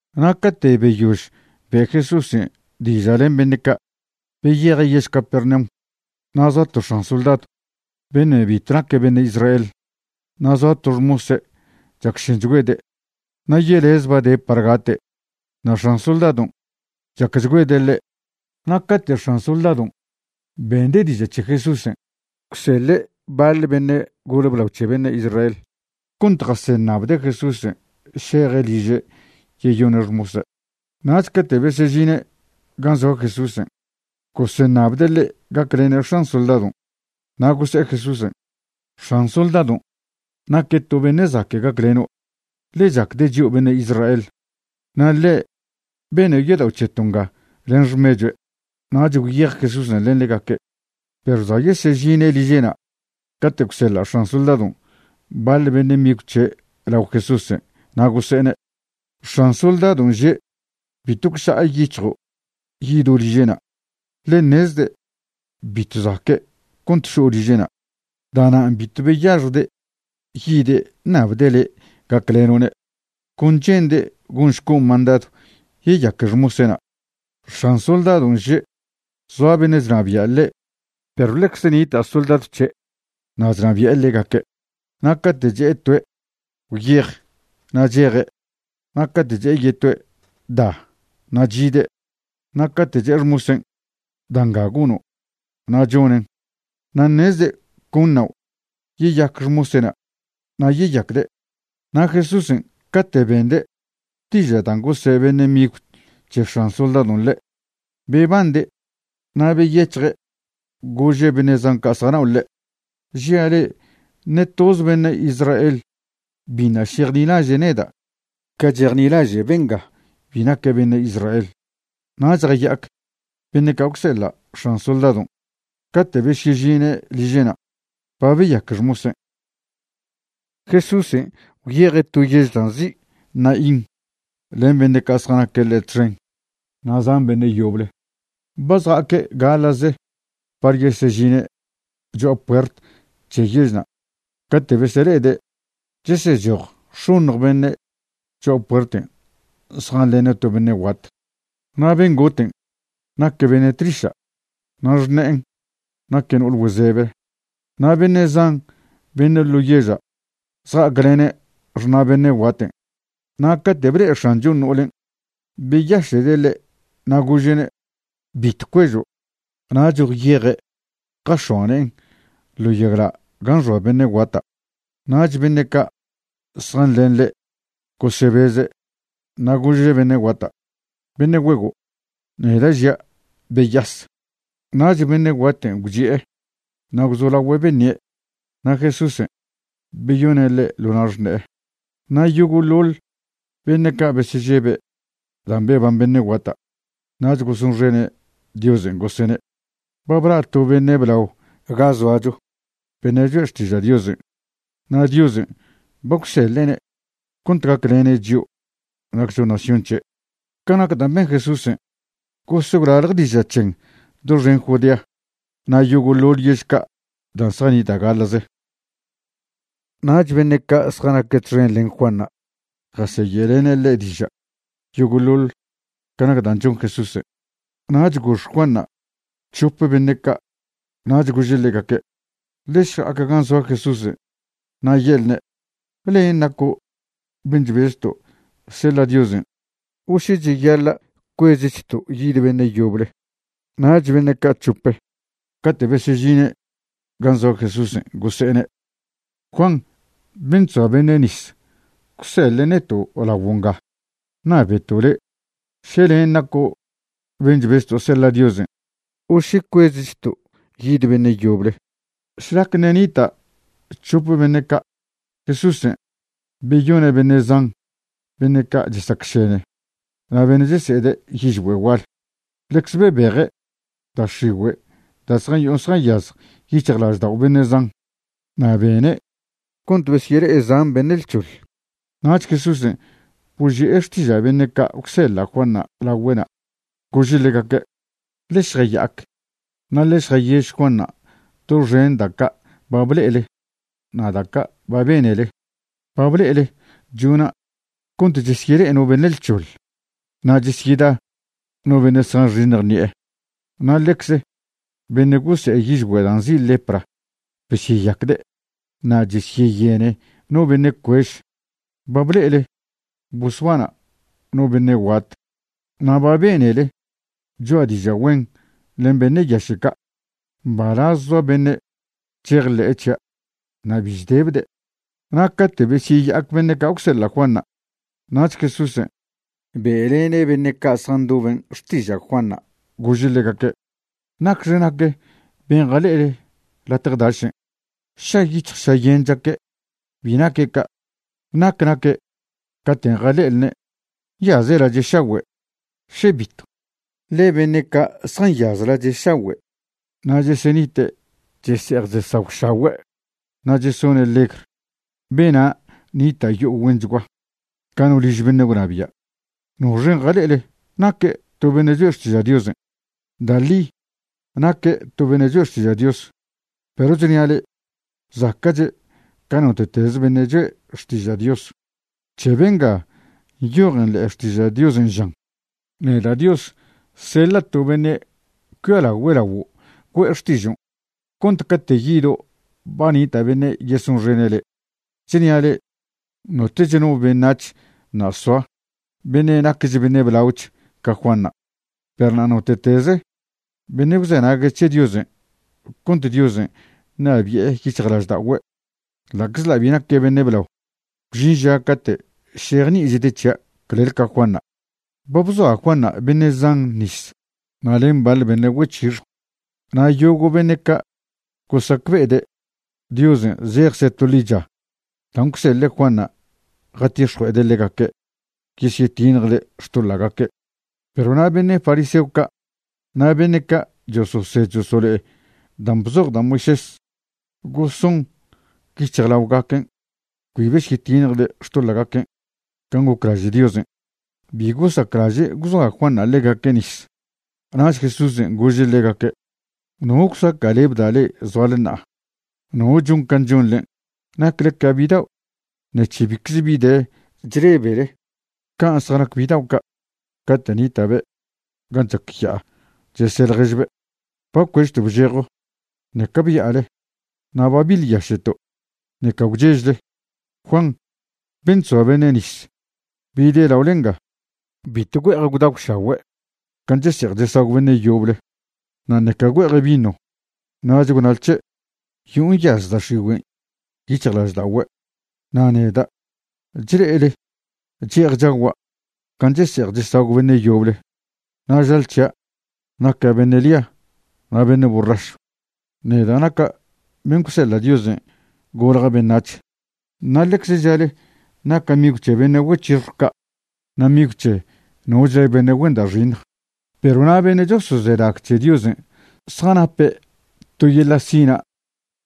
Na' cate' beyož be' Jesúsen' diža' len beṉe' ca', beyeje' yež Capernaum. Na' zoa to x̱an soldadw beṉe' bitw naque' beṉe' Israel. Na' zoa to xmose' chacšenchgüede', na' yelez ba de' par gate'. Na' x̱an soldadon' chacchgüede' ḻe'. Na' cate' x̱an soldadon' bende' diža' c̱he Jesúsen', gwseḻe' baḻ beṉe' gole blao c̱he beṉe' Israel cont jaseṉabde' Jesúsen' šeje' liže' yeyone' xmose'. Nach cate' besežine' gan' zoa Jesúsen', goseṉabde' ḻe' gaclene' x̱an soldadon'. Na' gose'e Jesúsen': ―X̱an soldadon' naque' to beṉe' zaque' gacleno', ḻe chacde' chio' beṉe' Israel, na' ḻe' bene' yodao' c̱heto' nga len xmechue'. Nach gwyej Jesúsen' len ḻegaque', perw za' yesežine' liže'na' cate' gwseḻa' x̱an soldadon' baḻ beṉe' migw c̱he' lao Jesúsen' na' gose'ene': ―X̱an soldadon' že' bitw gwša'a yic̱hjo' yido' liže'na', ḻe ṉezde' bitw zaque' cont šo' liže'na'. Da'nan' bitw beyaxjde' yide' ṉabde' le' gacleno'ne'. Con che'nde' gonšco' mandadw yeyaque xmose'na'. X̱an soldadon' že' zoa beṉe' chnabia' ḻe' perw ḻecze nita' soldadw c̱he' na' chnabi'e ḻegaque'. Na' cate' che'e toe': “Gwyej”, na' cheje', na' cate' che'e yetoe': “Da”, na' chide', na' cate' che'e xmosen': “Da' nga gono'”, na' chonen'. Na' ṉezde' con ṉao' yeyac xmose'na' na' yeyacde'. Na' Jesúsen' cate' bende' diža' dan' gose' beṉe' migw c̱he x̱an soldadon' ḻe', bebande' na' beyec̱hje' gože' beṉe' zan ca' zjanao' ḻe': ―Žia' le'e ṉe toze beṉe' Israel biṉa' šejnilaže' neda' ca chejnilaže' benga bi naque' beṉe' Israel. Nach jaya'ac beṉe' ca' gwseḻa' x̱an soldadon'. Cate' besyežine' liže'na' ba beyaque xmosen'. Jesúsen' gwyeje' to yež dan' nzi' Naín len beṉe' ca' zjanaque' ḻe' txen na' zan beṉe' yoble. Ba zja'aque' gaḻa'ze par yesežine' cho'a puert c̱he yežna' cate' besele'ede' chesechoj x̱oṉj beṉe' cho'a puerten' zjanḻene' to beṉe' guat. Na' ben' goten' naque' beṉe' tliša', na' xṉe'en naque' no'ole güezebe. Na' beṉe' zan beṉe' ḻo yeža' zja'aclene' xṉa' beṉe' guaten'. Na' cate' ble'e X̱anchon' no'olen', beyaše'de' ḻe' na' gože'ne': ―Bitw cuežo'. Nach gwyeje' jax̱oa ne'en ḻo yagla' gan' xoa beṉe' guata'. Nach beṉe' ca' zjanḻen ḻe' gosebeze'. Na' gože' beṉe' guata': ―Beṉe' güego', neda' žia', beyas. Nach beṉe' guaten' gwchi'e na' gwzolagüe' beṉie'. Na' Jesúsen' beyoṉe' ḻe' ḻo na' xṉe'e. Na' yogo'ḻoḻ beṉe' ca' besežebe' dan' beban beṉe' guata' nach gosonxene' Diosen' gosene': ―Ba bla' to beṉe' blao ga zoacho, beṉe' choe' xtiža' Diosen', na' Diosen' ba gwseḻe'ne' cont gaclene' chio' naccho nación c̱he'. Ca nac dan' ben Jesúsen' gos gwlalj diža' c̱hen' doxen Judea na' yogo'ḻoḻ yež ca' dan' zjanita' gaḻa'ze. Nach beṉe' ca' zjanaque' txen len Juanṉa' jaseye'lene' ḻe' diža' yogo'ḻoḻ ca nac dan' chon Jesúsen'. Nach gox Juanṉa' c̱hope beṉe' ca' nach gože' ḻegaque': ―Ḻe šja'ac gan' zoa Jesúsen' na' ye'lne': “¿Len' naco' ben' chbezto' seḻa' Diosen' o še cheyaḻa' cuezchto' yid beṉe' yoble?” Nach beṉe' ca' chope cate' besežine' gan' zoa Jesúsen' gose'ene': ―Juan ben' chzoa beṉe' nis gwseḻe' neto' laguo' nga ṉabeto' le' še len' naco' ben' chbezto' seḻa' Diosen' o še cuezchto' yid beṉe' yoble. Šlacte ṉe' nita' chope beṉe' ca', Jesúsen' beyone' beṉe' zan beṉe' ca' chesacšene na' beṉe' chese'ede' yižgüe' gual. Ḻecze bebeje' da' x̱igüe' da' zjayo'o zjanyaz yic̱hjlaždao' beṉe' zan. Na' bene' cont besyele'e zan beṉe' lc̱hoḻ. Nach Jesúsen' boži'e xtiža' beṉe' ca' gwseḻa' Juanṉa' lagüe'na', gože' ḻegaque': ―Ḻe šjaya'ac na' ḻe šjayež Juanṉa' doxen da' ca' ba ble'ele na' da' ca' ba benele. Ba ble'ele chona' cont chesyele'e no beṉe' lc̱hoḻ, na' chesyeda no beṉe' zjanxiṉj ṉi'e. Na' ḻecze beṉe' gose'e yižgüe' dan' nzi' lepra besyeyacde', na' chesyeyene no beṉe' cuež. Ba ble'ele bosbana' no beṉe' guat, na' ba benele choa' diža' güen len beṉe' yaše' ca'. Mbalaz zoa beṉe' chejḻe'e c̱hia' na' bi chdebde'. Na' cate' besyeya'ac beṉe' ca' gwseḻa' Juanṉa', nach Jesúsen' be'lene' beṉe' ca' zjandoben' xtiža' Juanṉa', gože' ḻegaque': ―¿Nacxe nac ben' jale'ele latje dašen'? ¿Šayic̱hj šayen chaque'? Bi naque' ca'. ¿Nac naque' caten' jale'elne'? ¿Nyaze' lache' šagüe'? ¿še bitw? ḻe beṉe' ca' zjanyaz lache' šagüe' na' chesenite' chese'ej chesagwšagüe' na' chesone' legr, bena' nita' yo'o güenchgua, ca no liž beṉe' gwnabia'. ¿Noxen' jale'ele? ¿Naque' to beṉe' choe' xtiža' Diosen'? Da' ḻi naque' to beṉe' choe' xtiža' Dios, perw chnia' le'e, zaca'che' ca note'teze beṉe' choe' xtiža' Dios. C̱he benga nyojen ḻe'e Xtiža' Diosen' žan: Neda' Dios seḻa' to beṉe' cuialagüe' laguo' güe'e xtižon' cont cate' yido' ba nita' beṉe' yesonxene' le'. Chnia' le'e, notech no beṉac̱h ṉa' soa beṉe' naquech beṉe' blaoch ca Juanṉa'. Perw na' note'teze beṉe' gwzenague' c̱he Diosen' cont Diosen' ṉabi'e yic̱hjlažda'ogüe', ḻa'czḻa' bi naque' beṉe' blao, gwžin ža cate' šejni'ichde' c̱hia' clel ca Juanṉa'. Ba bzoa Juanṉa' beṉe' zan nis na' len baḻ beṉe' güec̱hixjw. Na' yogo' beṉe' ca' gosacbe'ede' Diosen' zejcze' to ḻicha dan' gwseḻe' Juanṉa' jatix̱jue'ede' ḻegaque' yesyetiṉjde' xtoḻa'gaque'. Perw na' beṉe' fariseo ca' na' beṉe' ca' chososed chosolo'e dan' bzoj da' Moisés, goson yic̱hjlaogaquen' cbi besyetiṉjde' xtoḻa'gaquen' can' goclaže' Diosen'. Bi gosaclaže' gwzoa Juanṉa' ḻegaque' nis. Nach Jesúsen' gože' ḻegaque': ―¿No gwsaca'lebda' le'e zoale ṉa'a? ¿No chon can' chonḻen'? Nacle ca bidao' ṉec̱he bicze bi de chlebele. Can' zjanac bidao' ca', cate' nita'be' gan' chac ya'a chese' ḻježbe': “Ba bcuežto' bžejo, ṉeca bya'ale, na' ba biḻyaše'to', ṉeca gwchežle.” Juan ben' chzoa beṉe' nis bide' laole nga, bitw güe'ej gwdagwšagüe' can' chese'ej chesagw beṉe' yoble, na' ṉeca güe'eje' vino, nach gwnale c̱he': “Yo'o nyaz da' x̱igüen' yic̱hjlažda'ogüe'.” Na' neda', chle'ele che'ej chagua' can' chese'ej chesagw beṉe' yoble, na' žale c̱hia' naca' beṉe' lia na' beṉe' borrašw, neda' naca' ben' gwseḻa' Diosen' golja' beṉac̱h. Na' ḻecze žale naca' migw c̱he beṉe' güec̱hixjw ca' na' migw c̱he nochle beṉe' güen da' xiṉj. Perw na' beṉe' chosozenag c̱he Diosen' zjanape' to yeḻa' sina'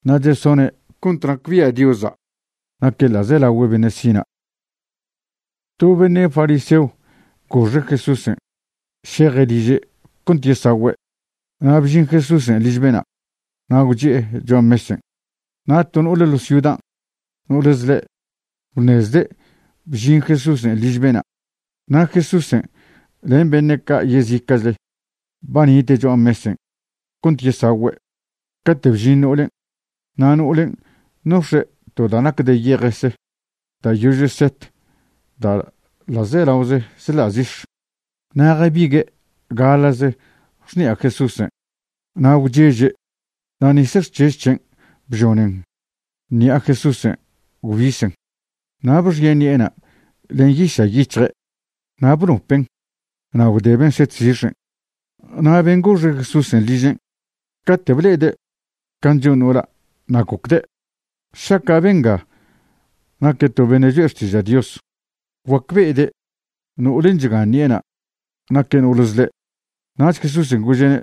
na' chesone' cont nacbia' Diosa' naque' ḻa'zelagüe' beṉe' sina'. To beṉe' fariseo goxe' Jesúsen' šeje' liže' cont yesagüe'. Na' bžin Jesúsen' liž bena' na' gwchi'e cho'a mesen'. Na' to no'ole ḻo ciudan', no'ole zḻe', gwṉezde' bžin Jesúsen' liž bena'. Na' Jesúsen' len beṉe' ca' yezica'chle ba nite' cho'a mesen' cont yesagüe', cate' bžin no'olen'. Na' no'olen' nox̱e' to da' nac de yejese da' yože set da' ḻa'zelaoze chḻa' zix̱. Na' jabigue' gaḻa'ze xṉi'a Jesúsen' na' gwcheže' na' nis xc̱hež c̱hen' bžonen ṉi'a Jesúsen' gwbisen. Na' bxie' ṉi'ena' len yiša' yic̱hje' na' bnopen' na' gwdeben' set zix̱en'. Na' ben' goxe' Jesúsen' ližen', cate' ble'ede' can' chon no'ola' na' gocde': “Šaca' benga naque' to beṉe' choe' xtiža' Dios, guacbe'ede' no'olen' chgan ṉi'ena' naque' no'ole zḻe'”. Nach Jesúsen' gože'ne':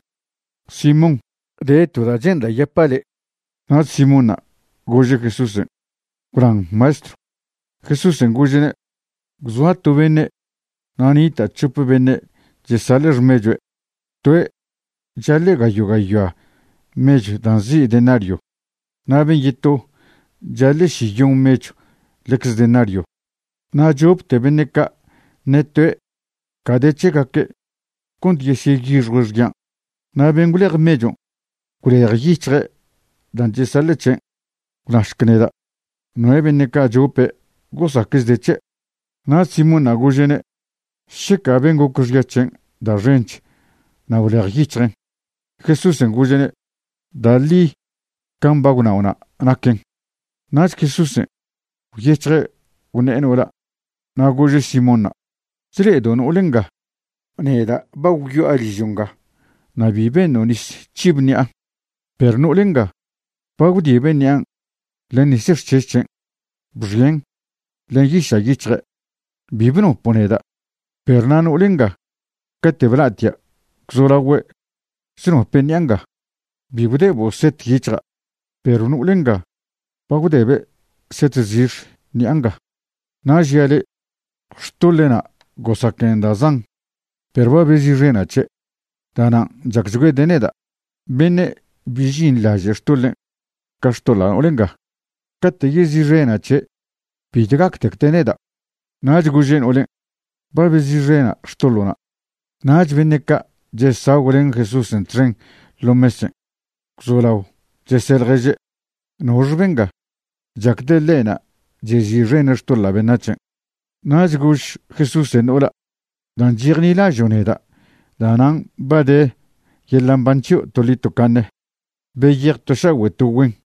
―Simón, de to da' che'nda' yapa' le'. Nach Simónṉa' gože' Jesúsen': ―Gwnan Maestrw. Jesúsen' gože'ne': ―Gwzoa to beṉe' na' nita' c̱hope beṉe' chesaḻe' xmechue'. Toe' chaḻe' gayo' gayoa mechw da' nzi' denario, na' ben' yeto chaḻe' šiyon mechw ḻecze denario. Na' chopte beṉe' ca' ṉe toe' ca de c̱hegaque' cont yesyeyixjue' xyan'. Na' ben' gwlej mechon' gwlejyic̱hje' dan' chesaḻe' c̱hen'. Gwnašc neda', ¿noe' beṉe' ca' chope' gosacchde' c̱he'? Nach Simónṉa' gože'ne': ―Šeca ben' goc xya c̱hen' da' xench na' gwlejyic̱hjen'. Jesúsen' gože'ne': ―Da' ḻi can' ba gwnao'na' naquen. Nach Jesúsen' gwyec̱hje' gwṉe'e no'ola' na' gože' Simónṉa': ―¿Chle'edo' no'ole nga? Neda' ba gwyo'a ližo' nga na' bi beṉo' nis c̱hib ṉi'a, perw no'ole nga ba gwdibe' ṉi'an' len nis xc̱hež c̱hen' bxien' len yiša' yic̱hje'. Bi bnopo' neda', perw na' no'ole nga cate' bla'atia' gwzolagüe' chnope' ṉi'a nga. Bi gwdebo' set yic̱hja', perw no'ole nga ba gwdebe' set zix̱ ṉi'a nga. Na' žia' le', xtoḻe'na' gosaquen da' zan, perw ba bezi'xena' c̱he'. Da'nan' chacchgüede' neda'. Beṉe' bi žinḻaže' xtoḻen' ca xtoḻa' no'ole nga, cate' yezi'xena' c̱he' bitw gactecde' neda'. Nach gože' no'olen': ―Ba bezi'xena' xtoḻo'na'. Nach beṉe' ca' chesagw len Jesúsen' txen ḻo mesen' gwzolao chese' ḻježe': ―¿Nox benga chacde' ḻe'na' chezi'xene' xtoḻa' beṉac̱hen'? Nach gož Jesúsen' no'ola': ―Dan' chejnilažo' neda' da'nan' ba de yeḻa' mban c̱hio' toḻi tocaṉe. Beyej to šagüe' to güen.